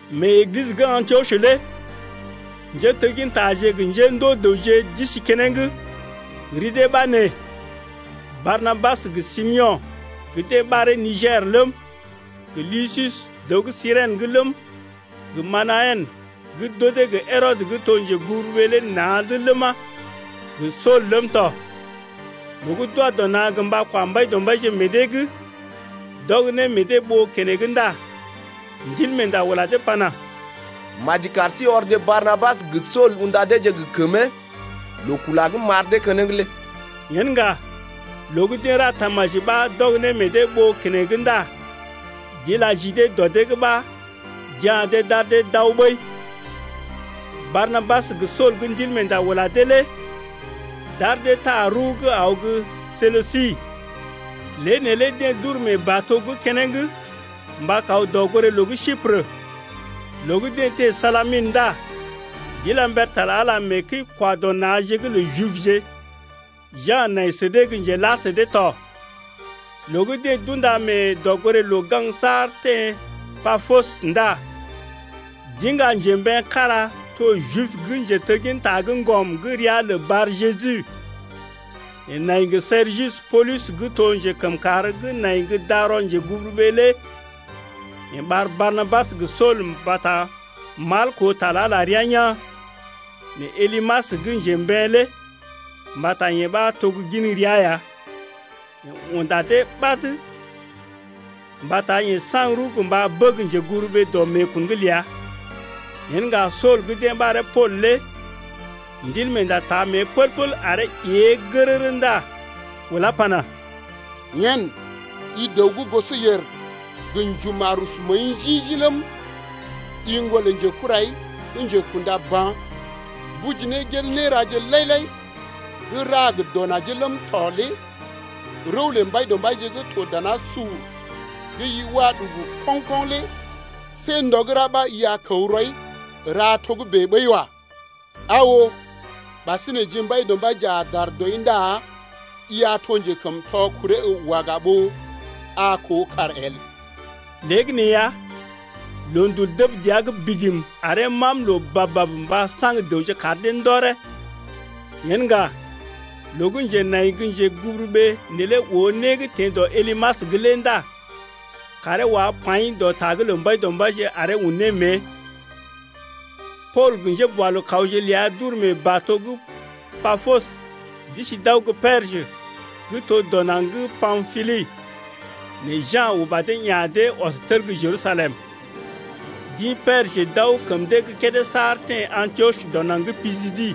Mee Eglisə gə́ Antiɔs lé njéteggintaje gə njéndoo né dəwje d’isi keneŋ, ri dee ɓa nee: Barnabas, gə Simeo̰ gə́ deḛ ɓaree Niger ləm, gə Lusius, dəw gə́ Sirèn’g ləm, gə Manahen gə́ d’odee gə Herɔdə gə́ to njeguburuɓee lé na̰’d ləma, gə Sool ləm tɔ. Loo gə́ d’wa dɔ na̰ gə mba kwa Mbaidɔmbaije meḛ dee’g, d’ɔg ne meḛ dee ɓoo keneŋ ndá Ndilmeenda ula dee pana: Maji kar sí ɔrje Barnabas gə Sool unda deeje gə kəmee loo kula gə́ m’ɓar dee keneŋ lé. Yen ŋga loo gə́ deḛ ra tamaji ɓa d’ɔg ne meḛ dee ɓoo keneŋ ndá d’ila ji dee dɔ dee’g ɓa d’ya̰ dee d’ar dee d’aw ɓəi. Barnabas gə Sool gə́ Ndilmeenda ula dee lé d’ar dee taa rəw gə́ aw gə́ Selusi, lée neelé deḛ d’uru mee bato’g keneŋ mba kaw dɔgoré-loo gə́ Siprə. Loo gə́ deḛ teḛ Salaminə ndá d’ila mber ta lə Ala mee kəi-kwa-dɔ-na̰je’g lə Jibje. Ja̰ nai sə dee gə́ njela sə dee tɔ. Loo gə́ deḛ d’unda mee dɔgoré-loo gaŋg saar teḛ Papos ndá d’iŋga njembeḛ kára to Jib gə́ njetegginta gə́ ŋgɔm gə́ ria lə Bar-Jeju. Yeḛ nai gə Sergius Poolus gə́ to njekəmkàr ləm si njeguburuɓee ləm tɔ lé. Yeḛ ɓar Barnabas gə Sool mbata mal koo ta lə Ala rəa yaa̰. Nɛ Elymas gə́ njembeḛ lé (mbata yee ɓa to gə́ gin ria ya), yeḛ unda dee ɓad mbata yeḛ saŋg rəw gə mba bəg njeguburuɓee dɔ meekun’g ləa. Yen ŋga Sool gə́ deḛ ɓaree Pool lé Ndilmeenda taa mée pəl-pəl aree ée gərərə ndá ulá pana: Yen i dəw gə́ gosɔyèr gə njuma̰ rusu məəi njḭ-njḭ ləm, i ŋgon lə njekurai gə́ njekunda ba̰, tuji ne gel néraje lai-lai gə́ ra gə dɔ najee ləm tɔ lé rəw lə Mbaidɔmbaije gə́ to danasur gə́ i wa ɗugu koŋ-koŋ lé see ndɔ gə́ ra ɓa i a kəw rɔi ra togə́bè ɓəi wa. Aa oo, ɓasinè, ji Mbaidɔmbaije a dar dɔi ndá i a to njekəmtɔ kuree əw waga ɓó a koo kàr el. Léegəneeya loondul dəb dəa’g bigim aree mam loo bab-bab mba saŋg dəwje kar dee ndɔree. Yen ŋga, loo gə́ njenai gə́ njeguburuɓee neelé oo né gə́ teḛ dɔ Elymas’g lé ndá kaaree wá paḭ dɔ ta’g lə Mbaidɔmbaije aree un ne mée tɔ. Pool gə njéboalookawje ləa d’uru mee bato’g Papos d’isi d’aw gə́ Perjə gə́ to dɔ naŋg gə́ Pampili. Nɛ Ja̰ uba dee ya̰ dee ɔs tel gə́ Jerusalem. D’ḭ Perjə d’aw kəm dee gə́ kédé saar teḛ Antiɔs dɔ naŋg gə́ Pisidi.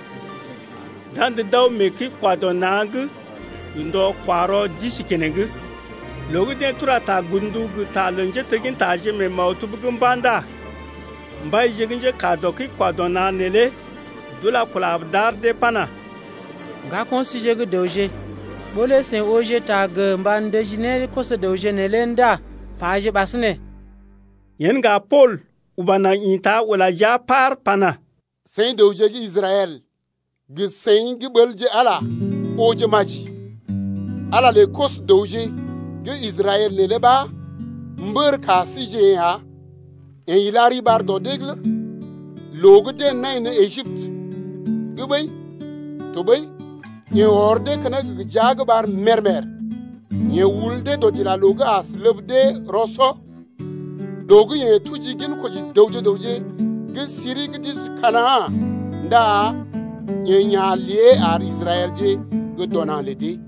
D’andə d’aw mee kəi-kwa-dɔ-na̰’g gə ndɔ-kwa-rɔ d’isi keneŋ. Loo gə́ deḛ tura ta godndu gə ta lə njéteggintaje mee maktub’g mba̰ ndá mbaije gə́ njékaa dɔ kəi-kwa-dɔ-na̰je neelé d’ula kula d’ar dee pana: Ŋgako̰ síje gə́ dəwje, ɓó lé seḭ ooje ta gə mba ndəji ne koso-dəwje neelé ndá paje ɓasinè. Yen ŋga Pool uba naŋg ḭta ula jia paar pana: Seḭ dəwje gə́ Israɛl, gə seḭ gə́ ɓəlje Ala lé ooje maji. Ala lə koso-dəwje gə́ Israɛl neelé ɓa mbər ka síjeḛ ya. Yeḛ ila riɓar dɔ dee’g loo gə́ deḛ nai ne Ejiptə’g ɓəi tɔɓəi yeḛ ɔr dee keneŋ gə jia gə ɓar mèr-mèr. Yeḛ ul dee dɔdilaloo’g as ləb dee rɔ-sɔ. Loo gə́ yeḛ tuji ginkoji dəwje gə raŋg gə́ siri gə́ d’isi Kana̰ ndá yeḛ ya̰ lée ar Israɛlje gə́ dɔ naŋg lə dee.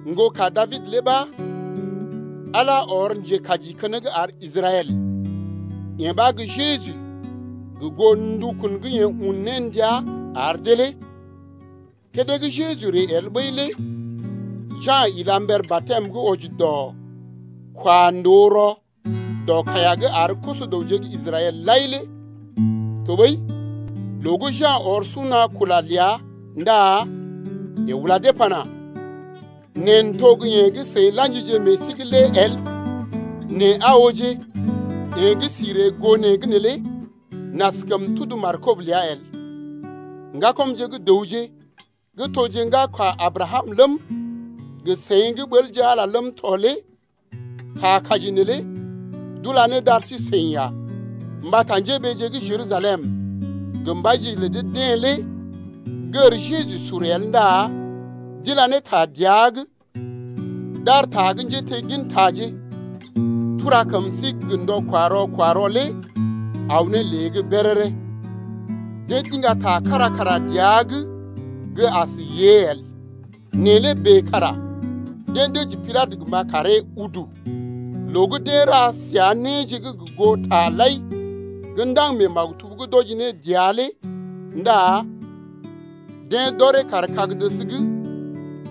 Ŋgoka Dabid lé ɓa Ala ɔr njekaji keneŋ ar Israɛl, yee ɓa gə́ Jeju gə goo ndukun gə́ yeḛ un ne ndia ar dee lé. Kédé gə́ Jeju ree el ɓəi lé Ja̰ ila mber batɛm gə́ wɔji dɔ kwa ndòo rɔ dɔ kaiya’g ar koso-dəwje gə́ Israɛl lai lé. Tɔɓəi loo gə́ Ja̰ ɔr suna kula ləa ndá yeḛ ula dee pana: Neḛ n’to gə́ yeḛ gə́ seḭ la̰jije meḛ sí’g lé el, nɛ aa ooje yeḛ gə́ si ree gə́ goo neḛ’g neelé n’askəm tudu markob ləa el. Ŋgakɔmje gə́ dəwje gə́ toje ŋgaka Abrakam ləm, gə seḭ gə́ ɓəlje Ala lé ləm tɔ lé ta kaji neelé d’ula ne d’ar sí-seḭ ya. Mbata njéɓeeje gə́ Jerusalem gə mbaije lə dee-deḛ lé gər Jeju sur el ndá d’ila ne ta dəa’g d’ar ta gə́ njéteggintaje tura kəm sí’g gə ndɔ-kwa-rɔ kwa-rɔ lé aw ne lée’g béréré. Deḛ d’iŋga ta kára kara dəa’g gə́ as yée el, nɛ lé bèe kara deḛ dəji Pilatə gə mba karee udu ya. Loo gə́ deḛ ra səa néje gə goo taje lai gə́ ndaŋg mee maktub’g d’wɔji ne dəa lé ndá deḛ d’ɔree kaar kag-dəs’g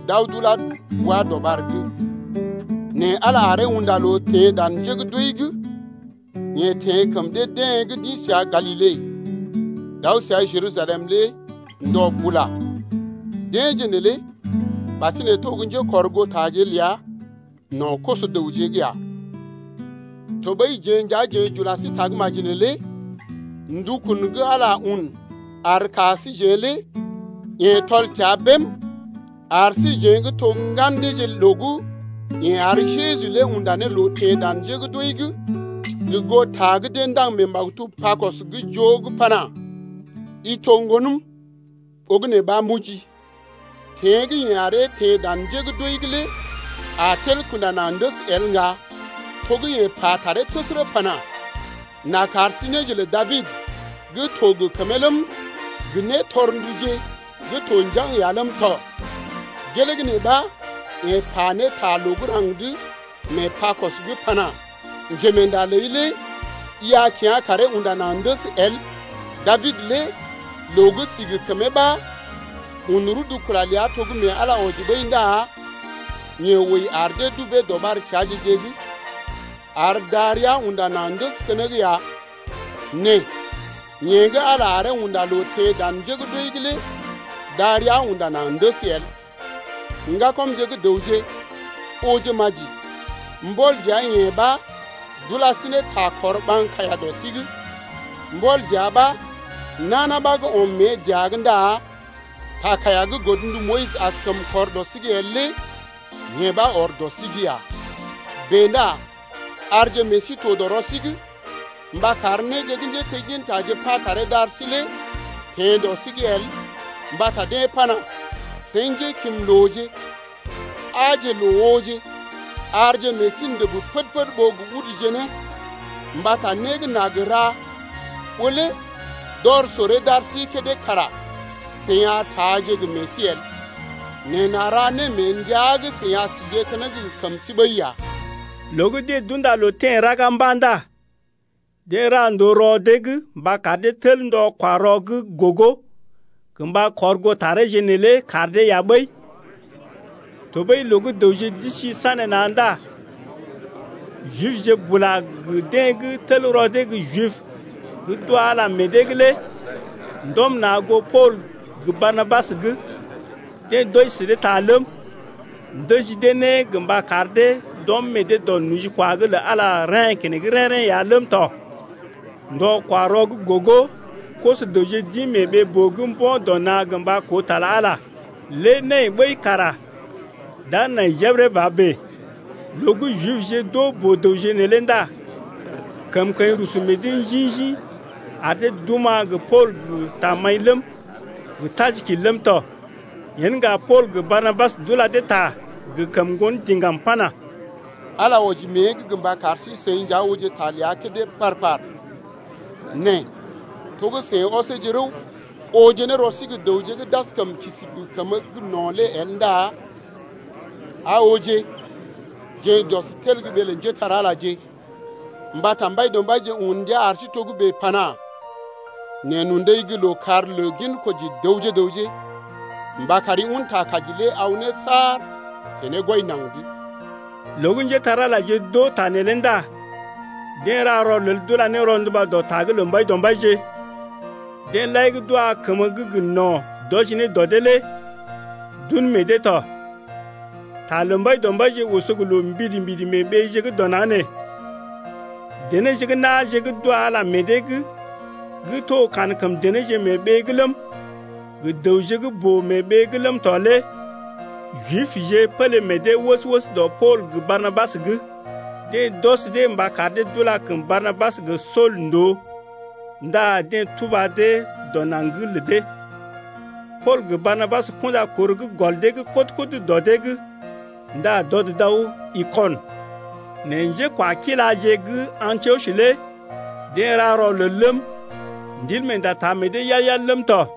d’aw d’ulá bwa-dɔɓar’g. Nɛ Ala aree unda loo teḛ dan njé gə́ d’wəi’g. Yeḛ teḛ kəm dee-deḛ gə́ d’ḭ səa Galile d’aw səa Jerusalem lé ndɔ bula. Deḛje neelé ɓasinè to gə́ njékɔrgootaje ləa no̰ koso-dəwje’g ya. Tɔɓəi jeḛ nja jeḛ j’ula sí tagə́maji neelé, ndukun gə́ Ala un ar ka síjeḛ lé yeḛ tɔl təa bém ar síjeḛ gə́ to ŋgan deeje loo gə́ yeḛ ar Jeju lé unda ne loo teḛ dan njé gə́ d’wəi’g gə goo ta gə́ deḛ ndaŋg mee maktub Pakɔs’g gə́ joo’g pana: I to Ŋgonəm, Ɓogənè ɓa m’ojii. Teḛ gə́ yeḛ aree teḛ dan njé gə́ d’wəi’g lé a tel kunda naŋg ndəs el ŋga to gə́ yeḛ pa ne taree təsərə pana: N’a kar sí néje lə Dabid gə́ to gə kəmee ləm, gə nétɔrnduje gə́ to njaŋg ya ləm tɔ. Gelee gə́ nee ɓa yeḛ pa ne ta loo gə́ raŋg’d mee Pakɔs’g pana: Njemeenda ləi lé i a kyá̰ karee unda naŋg ndəs el. Dabid lé loo gə́ si gə kəmee ɓa un rudu kula ləa to gə́ mee Ala wɔji ɓəi ndá yeḛ wəi ar dee dubee dɔɓar keaje-je’g, ar darəa unda naŋg ndəs keneŋ ya. Nɛ yeḛ gə́ Ala aree unda loo teḛ dan njé gə́ d’wəi’g lé darəa unda naŋg ndəs el. Ŋgakɔmje gə́ dəwje, ooje maji, mbɔl dəa-yeḛ ɓa d’ula sí ne ta kɔr ɓaŋg kaiya dɔ sí’g. Mbɔl dəa ɓa nana ɓa gə́ ɔm mée dəa’g ndá ta kaiya gə́ godndu Moyis askəm kɔr ne dɔ sí’g el lé yee ɓa ɔr dəa’g ya. Bèe ndá arje meḛ sí to dɔ rɔ sí’g mba kar néje gə́ njéteggintaje pa taree d’ar sí lé teḛ dɔ sí’g el mbata deḛ pana: Seḭ njékimlooje, aaje loo ooje, Arje meḛ sí ndəb pəd-pəd ɓó gə uduje ne, Mbata né gə́ n’a gə ra ɓó lé d’ɔr soree d’ar sí kédé kara seḭ a taaje gə meḛ sí el, Nɛ n’a ra né mee ndəa gə́ seḭ a síje keneŋ gə kəmə sí ɓəi ya. Loo gə́ deḛ d’unda loo teḛ raga mba̰ ndá deḛ ra ndòo rɔ dee’g mba kar dee tel ndɔ-kwa-rɔ gə́ gogo gə mba kɔr goo tareeje neelé kar dee ya ɓəi. Tɔɓəi loo gə́ dəwje d’isi sanéna̰ ndá Jibje bula gə deḛ gə́ tel rɔ dee gə́ Jibje gə́ d’wa Ala meḛ dee’g lé ndɔm na̰ goo Pool gə Barnabas’g. Deḛ d’wɔji sə dee ta ləm, ndəji dee ne gə mba kar dee d’ɔm meḛ dee dɔ nojikwa’g lə Ala lé reḛ́ keneŋ rḛ́-rḛ́ ya ləm tɔ. Ndɔ-kwa-rɔ gə́ gogo koso-dəwje d’ḭ mee ɓee-boo’g mbo̰ dɔ na̰ gə mba koo ta lə Ala lé, lé nai ɓəi kara d’a nai jebəre ba bèe. Loo gə́ Jibje d’oo boo-dəwje neelé ndá kəmkəḭ rusu meḛ dee njḭ-njḭ ar dee d’oma̰ gə Pool gə tamaḭ ləm, gə tajikil ləm tɔ. Yen ŋga Pool gə Barnabas d’ula dee ta gə kəm ŋgon diŋgam pana: Ala wɔji mée’g gə mba kar sí-seḭ nja ooje ta ləa kédé par-par, nɛ to gə́ seḭ ɔseeje rəw, ooje ne rɔ sí gə́ dəwje gə́ d’askəm kisi gə kəmə gə́ gə no̰ lé el ndá aa ooje, jeḛ j’ɔs n’tel gə́ ɓee lə njépole-magəje. Mbata Mbaidɔmbaije un ndia ar sí togə́bè pana: Neḛ n’undai gə́ lookàr lə ginkoji dəwje gə raŋg Mba kari un ta kaji lé aw ne saar teḛ ne gwɔi naŋg’d. Loo gə́ njépole-magəje d’oo ta neelé ndá deḛ ra rɔlel d’ula ne rɔnduba dɔ ta’g lə Mbaidɔmbaije. Deḛ lai gə́ d’wa kəmə gə́ gə no̰ d’wɔji ne dɔ dee lé d’un meḛ dee tɔ. Ta lə Mbaidɔmbaije oso gə loo mbidi-mbidi mee ɓeeje gə́ dɔ naŋg nee. Denéje gə́ na̰je gə́ d’wa Ala meḛ dee’g gə́ to kankəm denéje mee ɓee’g ləm, gə dəwje gə́ boo mee ɓee’g ləm tɔ lé Jibje pélé meḛ dee wəs-wəs dɔ Pool gə Barnabas’g. Deḛ d’ɔs dee mba kar dee d’ula kəm Barnabas gə Sool ndòo ndá deḛ tuba dee dɔ naŋg’g lə dee. Pool gə Barnabas kunda kor gə́ gɔl dee’g kɔd-kɔd dɔ dee’g ndá d’ɔd d’aw Ikɔnə. Nɛ njékwakiláje gə́ Antiɔs lé deḛ ra rɔlel ləm, Ndilmeenda taa meḛ dee yal-yal ləm tɔ.